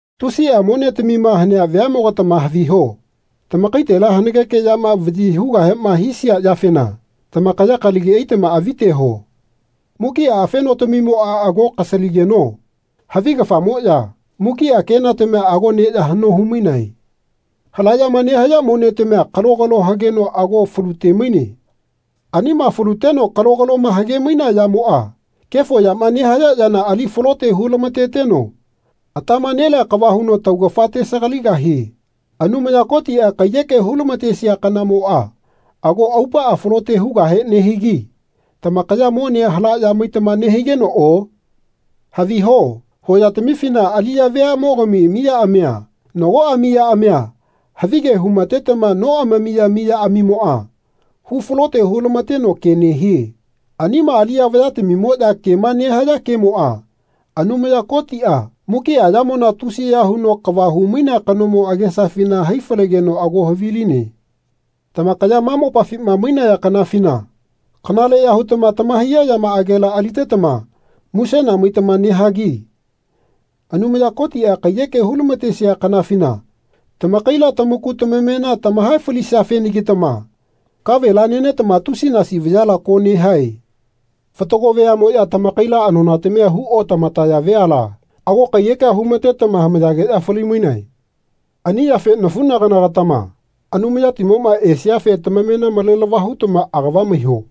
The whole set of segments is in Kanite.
Tusia monetamima hanea veamogatama haviho. Tamakaitela hanageke yama vayi hugahema hisia yafena tamakaya kalagi aitama aviteho. Mukia afenotamimoa ago kasaligeno havigafamoya mukia kenatamia ago neya hano humainae. Halayama nehaya monetamia kalogalo hageno ago falute-maine. Anima faluteno kalogaloma hage-mainea yamoa kefo yama nehaya yana ali falote hulamateteno atama nelea kava huno tamaugafa tesagaligahie. Anumaya Kotia kaiyeke hu-lamatesia kanamoa ago aupaa falote hugahe nehigi tamakaya monea halaya maitama nehigenoo. Haviho hoyatamifina aliya veamogami miyaamia nagoa miyaamia havige hu-matetama noamamiya miyaamimoa hu falote hu-lamateno ke nehie. Anima aliya vayatamimoya kema nehaya kemoa Anumaya Kotia, mukia yamona tusiya huno kava humainea kanomo, agesafina hai falegeno ago haviline. Tamakaya ma mopafima mainaya kanafina kanaleya hutama tamahaiya yamaagela alitetama musena maitama nehagi Anumaya Kotia kaiyeke hu-lamatesia kanafina tamakaila tamaku tamamena tamahae falisiafenagitama kavela nenetama tusinasi vayala ko nehae. Fatago veamoya tamakaila anonatamia hu otamataya veala, ago kaiyekea humatetama hamaeyageya fali-mainae. Ani yafe nafunagana-gatama Anumayatimoma esiafe tamamena malelava hutama agava maiho.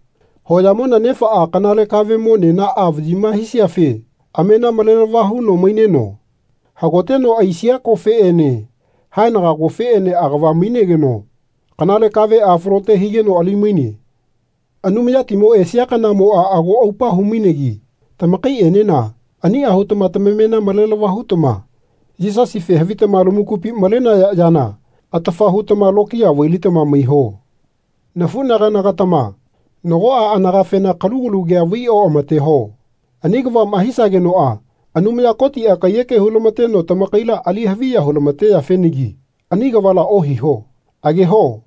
Hoyamona nefaa kanale kavemo nenaa vayima hisiafe amena malelava huno maineno hagoteno aisia kofeene haenaga kofeene agava mainegeno kanale kavea falote higeno ali-maine. Anumayatimo esia kanamoa ago aupa hu-mainegi tamakaienena ania hutama tamamena malelava hutama Yisasife havitama lamakupi malenaya yana atafa hutama lokiya vai-litama maiho. Nafunagana-gatama nagoa anagafena kalugalu kea vai oamateho. Ani kavama hisagenoa Anumaya Kotia kaiyeke hu-lamateno tamakaila ali haviya hu-lamateyafenagi ani kavala ohiho. Ageho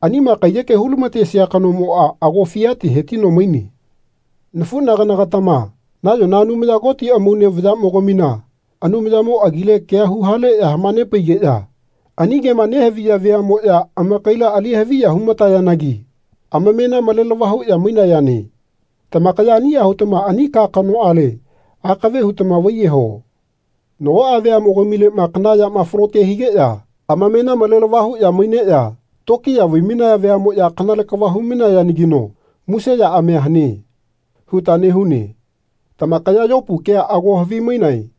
anima kaiyeke hu-lamatesia kanomoa ago fiate hetino maine. Nafunagana-gatama nayona Anumaya Koti amaune vayamogamina Anumayamo agile kea huhaleya hamanepaigeya ani kema nehaviya veamoya amakaila ali haviya hu-matayanagi amamena malelava huya mainayane. Tamakaya ania hutama ani ka kanoale akave hutama vaiyeho. Nagoa veamogamilema kana yama falote higeya amamena malelava huya maineya tokiya vai-mainaya veamoya Kanale kava hu-mainayanagino muse yaamia hane. huta nehune. Tamakaya Yopu kea ago havimainae.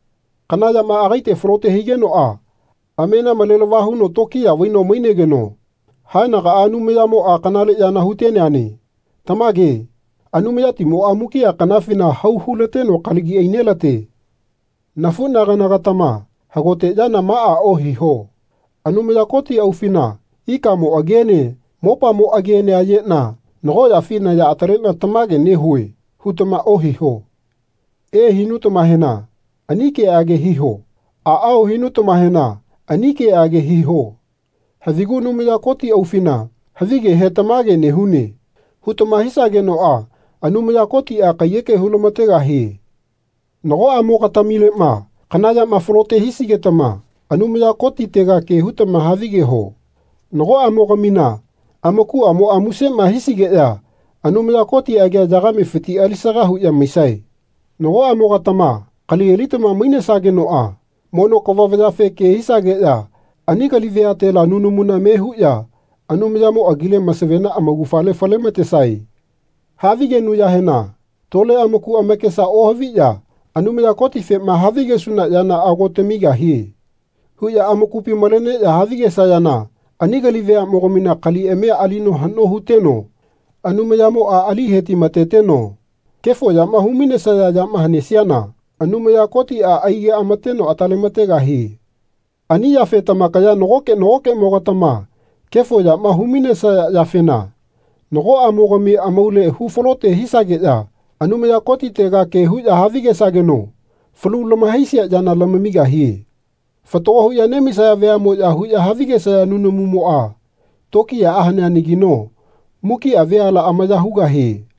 Kana yama agaite falote higenoa amena malelava huno tokiya vaino mainegeno haenagaa Anumayamoa kanale yana huteneane. Tamage Anumayatimoa mukia kanafina hau hulateno kalagi ainelate. Nafunagana-gatama hagote yana maa ohiho. Anumaya Koti aufina ikamo agiene mopamo agiene ayena nagoyafi naya atalena tamage nehue. hutama ohiho. E. hinutamahena ani keage hiho. Aao. hinutamahena ani keage hiho. Havigu Anumaya Koti aufina havigehe Tamage nehune. hutama hisagenoa Anumaya Kotia kaiyeke hu-lamategahie. Nagoamo-gatamilema kana yama falote hisigetama Anumaya Kotitega ke hutama havigeho. Nagoamo-gamina amakuamoa musema hisigeya Anumaya Koti agia yagamefiti alisaga huya maisae. Nagoamo-gatama kali alitama mainesagenoa mono kava vayafe ke hisageya ani kali veatela nunamu me huya Anumayamo agile masavena amaugafale fale-matesae. Havigenuyahena tole amaku amakesa ohaviya Anumaya Kotifema havigesuna yana ago tamigahie. huya amakupi maleneya havigesayana ani kali veamogamina kaliamia alino hano huteno Anumayamoa ali hetimateteno kefo yama hu-mainesaya yama hanesiana Anumaya Kotia aigeamateno atalemategahie. Ani yafe tamakaya nagoke nagokemo-gatama kefo yama humainesaya yafena nagoamo-gami amaule hu falote hisageya Anumaya Kotitega ke huya havigesageno falu lamahaisia yana lamamigahie. Fatagoma huya nemaisaya veamoya huya havigesaya nunamumoa tokiyaa haneanagino mukia veala amaya hugahie.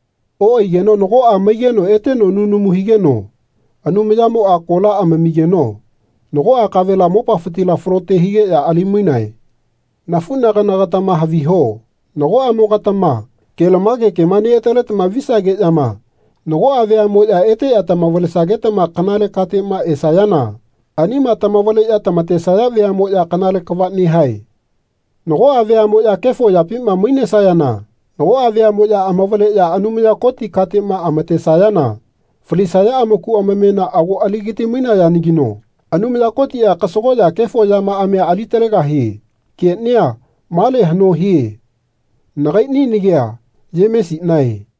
Oaigeno nagoa maigeno eteno nunamu higeno Anumayamoa kola amamigeno nagoa kavela mopafitila falote higeya ali-mainae. Nafunaganagatama haviho nagoamo-gatama kelamage kema neataletama visageyama nagoa veamoya eteya tamavalesagetama kanale katema esayana anima tamavaleya tamatesaya veamoya kanale kava nehae. Nagoa veamoya kefo yapima mainesageya nagoa veamoya amavaleya Anumaya Koti katema amatesayana falisaya amaku amamena ago aligati-mainayanagino Anumaya Kotia kasagoya kefo yamaamia alitalegahie. Kenia male hano hie. Nagaini nagia Yemesinae.